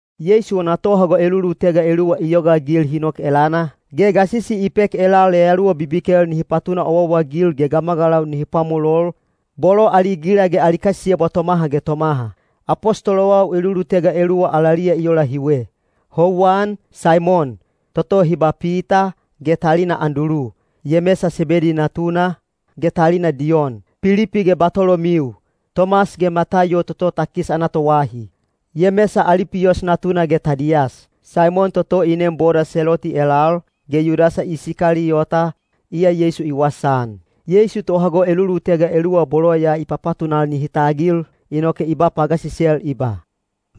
Yeisu wana tohago elulutega eluwa i yogaagil hi nok elana, ge gasisi i pek elal yayaluwa bibikel nihi patuna owaowa-agil ge gamagalau nihi pwamolol, bolo ali gila ge ali kasiyebwa tomaha ge tomaha. Apostolowau elulutega eluwa alaliya i ola hiwe: houwan, Saimon, toto hi ba Pita, ge talina Andulu; Yemesa Sebedi natuna, ge talina Diyon; Pilipi ge Batolomiu; Tomas ge Mataiyo toto takis ana toahi; Yemesa Alipiyos natuna ge Tadiyas; Saimon toto i neem boda Seloti elal, ge Yudasa Isikaliyota, iya Yeisu i wasaan. Yeisu tohago elulutega eluwa bolo ya i papatunal nihi tagil, inoke i ba pagasisel i ba,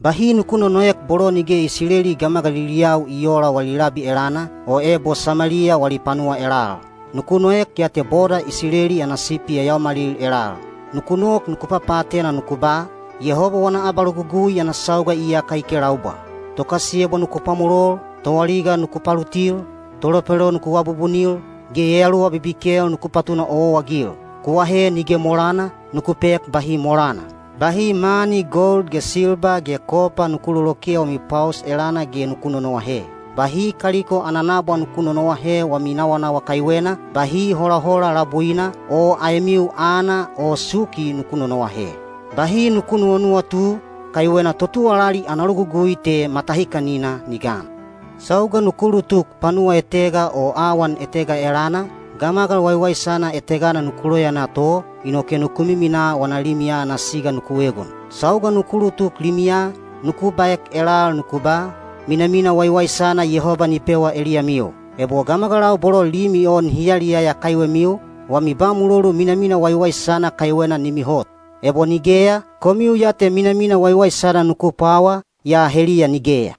“Bahi nuku nonoek bolo nige Isileli gamagaliliyau i oola wali labi elana, o ebo Sameliya wali panuwa elal. Nuku noek ya te boda Isileli ana sipi yayaomalil elal. Nuku nok nuku papaatena nuku ba, ‘Yehoba wana abalogugui ana sauga iyaka i kelaubwa.’ Tokasiyebwa nuku pwamolol, toaliga nuku palutil, tolepelo nuku abubunil, ge yayaluwa bibikel nuku patuna owaowa-agil. Ku ahe nige molana, nuku pek bahi molana. Bahi mani gold, silba o kopa nuku loloke wami pwaos elana ge nuku nonoahe; bahi kaliko ana nabwa nuku nonoahe wami nawanawa kaiwena, bahi holahola labuina, o aemiu aana o suki nuku nonoahe. Bahi nuku nuwanuwatu, kaiwena totuwalali ana logugui te matahikanina ni gan. Sauga nuku ulutuk panuwa etega o awan etega elana, gamagal waiwaisana etegana nuku loyaana to, inoke nuku miminaa wana limiya ana siga nuku egon. Sauga nuku ulutuk limiya, nuku baek elal nuku ba, ‘Minamina waiwaisana Yehoba ni pewa eliyamiu.’ Ebo gamagalau bolo limi o nihi yaliyaya kaiwemiu, wami ba mulolu minamina waiwaisana kaiwena ni mihot. Ebo nigeya, komiu ya te minamina waiwaisana nuku pwawa, yaa heliya nigeya.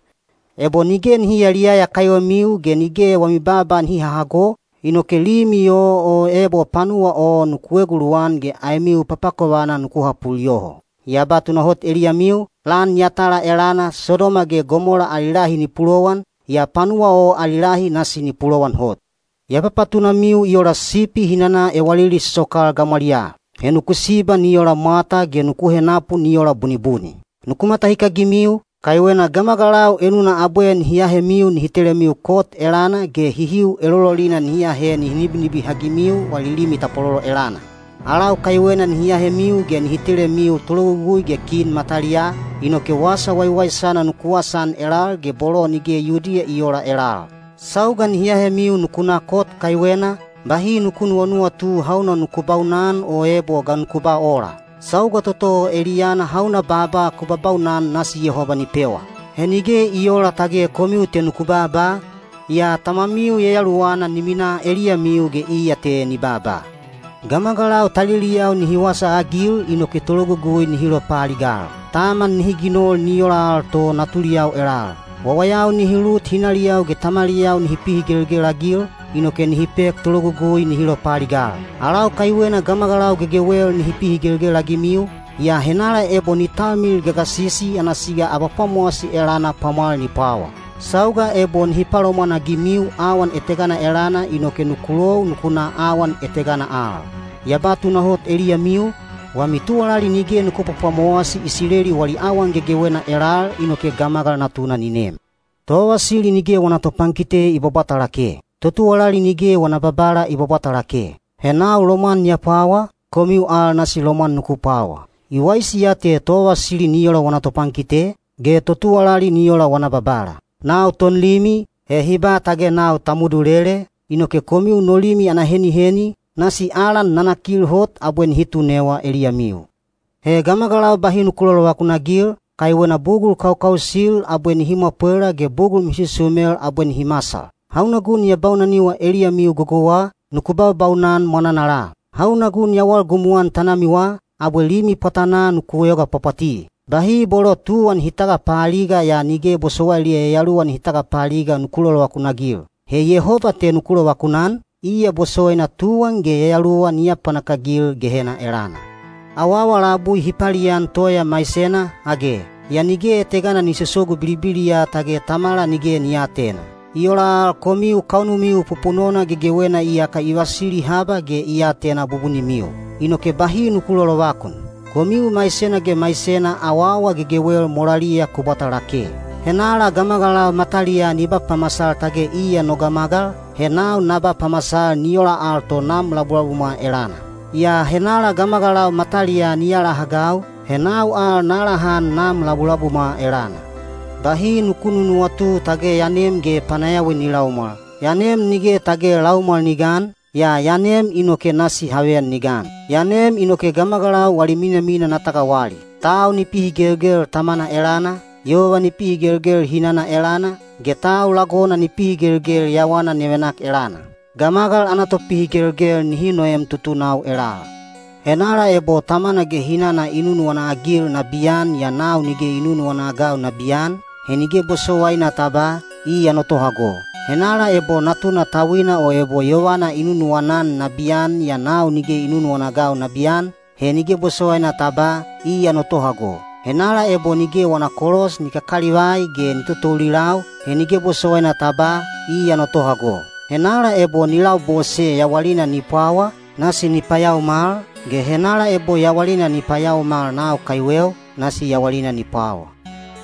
Ebo nige nihi yayaliyaya kaiwemiu ge nige wami baaba nihi hahago, inoke limi o o ebo panuwa o nuku eguluwan ge aemiu papakovana nuku hapul yoho. Ya ba tunahot eliyamiu, lan yatala elana Sodoma ge Gomola ali lahi ni pulowan, yaa panuwa o ali lahi nasi ni pulowan hot. Ya papatunamiu i ola sipi hi nana ewalili sosokal gamwaliyaa. He nuku siba ni ola mwata ge nuku henapu ni ola bunibuni. Nuku matahikagimiu, kaiwena gamagalau enuna abwe nihi ahemiu nihi telemiu kot elana ge hihiu elololina nihi ahe nihi nibinibihagimiu wali limi tapwalolo elana. Alau kaiwena nihi ahemiu ge nihi telemiu tologugui ge kin mataliyaa, inoke wasa waiwaisana nuku wasaan elal ge bolo nige Yudiya i oola elal. Sauga nihi ahemiu nuku na kot kaiwena, bahi nuku nuwanuwatu hauna nuku baunan o ebo ga nuku ba ola. Sauga toto o eliyana hauna baaba ku babaunan nasi Yehoba ni pewa. He nige i oola tage komiu te nuku baaba, yaa Tamamiu Yayaluwana ni minaa eliyamiu ge iya te ni baaba. Gamagalau taliliyau nihi wasaagil inoke tologugui nihi lopaaligal. Taman nihi ginol ni ola al to natuliyau elal. Wawayau nihi lut hinaliyau ge tamaliyau nihi pihigelgel-agil, inoke nihi pek tologugui nihi lopaaligal. Alau kaiwena gamagalau gegewel nihi pihigelgel-agimiu, yaa henala ebo ni talmilil gagasisi ana siga abapwamowasi elana pwamwal ni pwawa. Sauga ebo nihi palomwanagimiu awan etegana elana inoke nuku lou nuku na awan etegana al. Ya ba tunahot eliyamiu, wami tuwalali nige nuku pwapwamowasi Isileli wali awan gegewena elal inoke Gamagal Natuna ni nem. Tovavasili nige wana topankite i bwabwata lake; totuwalali nige wana babala i bwabwata lake. He nau lomwan ya pwawa, komiu al nasi lomwan nuku pwawa. I waisi ya te tovavasili ni ola wana topankite, ge totuwalali ni ola wana babala. Nau tonlimi, he hi ba tage nau Tamudulele, inoke komiu no limi ana heniheni, nasi alan nanakil hot abwe nihi tunewa eliyamiu. He gamagalau bahi nuku lolovakun-agil, kaiwena bugul kaukausil abwe nihi mwapwela ge bugul misusumel abwe nihi masal. Hauna gun ya baunaniwa eliyamiu gogouwa, nuku baubaunan mwananala; hauna gun ya walgumuan tanamiwa, abwe limi pwatanaa nuku yoga pwapwati. Bahi bolo tuwan hi tagapaaliga yaa nige bosowailiya yayaluwa nihi tagapaaliga nuku lolovakun-agil. He Yehoba te nuku lovakunan, iya bosowaina tuwan ge yayaluwa ni apapanak-agil Gehena elana. Awaawa labui hi palian toya maisena, age? Yaa nige etegana ni sosogu bilibiliya tage Tamamiu nige ni aatena. I ola al komiu kaunumiu pupunona gegewena iyaka i vasili haba ge i atena bubunimiu. Inoke bahi nuku lolovakun. Komiu maisena ge maisena awaawa gegewel molaliya ku bwata lake. Henala gamagalau mataliyaa ni ba pamasal tage iya no gamagal, he nau na ba pamasal ni ola al to Nam labulabumwa elana. Yaa henala gamagalau mataliyaa ni alahagau, he nau al na alahan Nam labulabumwa elana. Bahi nuku nunuwatu tage ya nem ge panayawi ni laumwal. Ya nem nige tage laumwal ni gan, yaa ya nem inoke nasi haveyan ni gan. Ya nem inoke gamagalau wali minamina na tagawali. Tau ni pihigelgel tamana elana, yova ni pihigelgel hinana elana, ge tau lagona ni pihigelgel yawana nevenak elana. Gamagal ana topihigelgel nihi noem tutunau elal. Henala ebo tamana ge hinana i nunuwana-agil nabiyan yaa nau nige i nunuwana-agau nabiyan, he nige bosowaina ta ba, ‘Iya no tohago.’ Henala ebo natuna tauina o ebo yovana i nunuwana-an nabiyan yaa nau nige i nunuwana-agau nabiyan, he nige bosowaina ta ba, ‘Iya no tohago.’ Henala ebo nige wana kolos ni kakalivai ge ni totoulilau, he nige bosowaina ta ba, ‘Iya no tohago.’ Henala ebo ni labose yawalina ni pwawa, nasi ni payaomal, ge henala ebo yawalina ni payaomal nau kaiweu, nasi yawalina ni pwawa.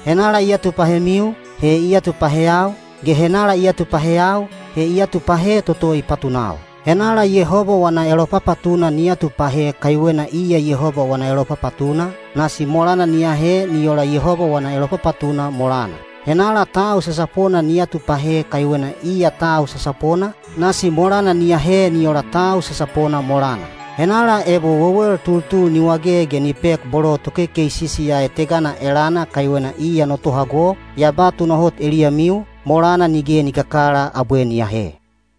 Henala i atupahemiu, he i atupaheyau, ge henala i atupaheyau, he i atupahe toto i patunau. Henala Yehoba wana elopapatuna ni atupahe kaiwena iya Yehoba wana elopapatuna, nasi molana ni ahe ni ola Yehoba wana elopapatuna molana; henala tau sasapona ni atupahe kaiwena iya tau sasapona, nasi molana ni ahe ni ola tau sasapona molana. Henala ebo wewel tultul ni wage ge ni pek bolo tokekeisi ya etegana elana kaiwena iya no tohago, ya ba tunahot eliyamiu, molana nige ni kakala abwe ni ahe.”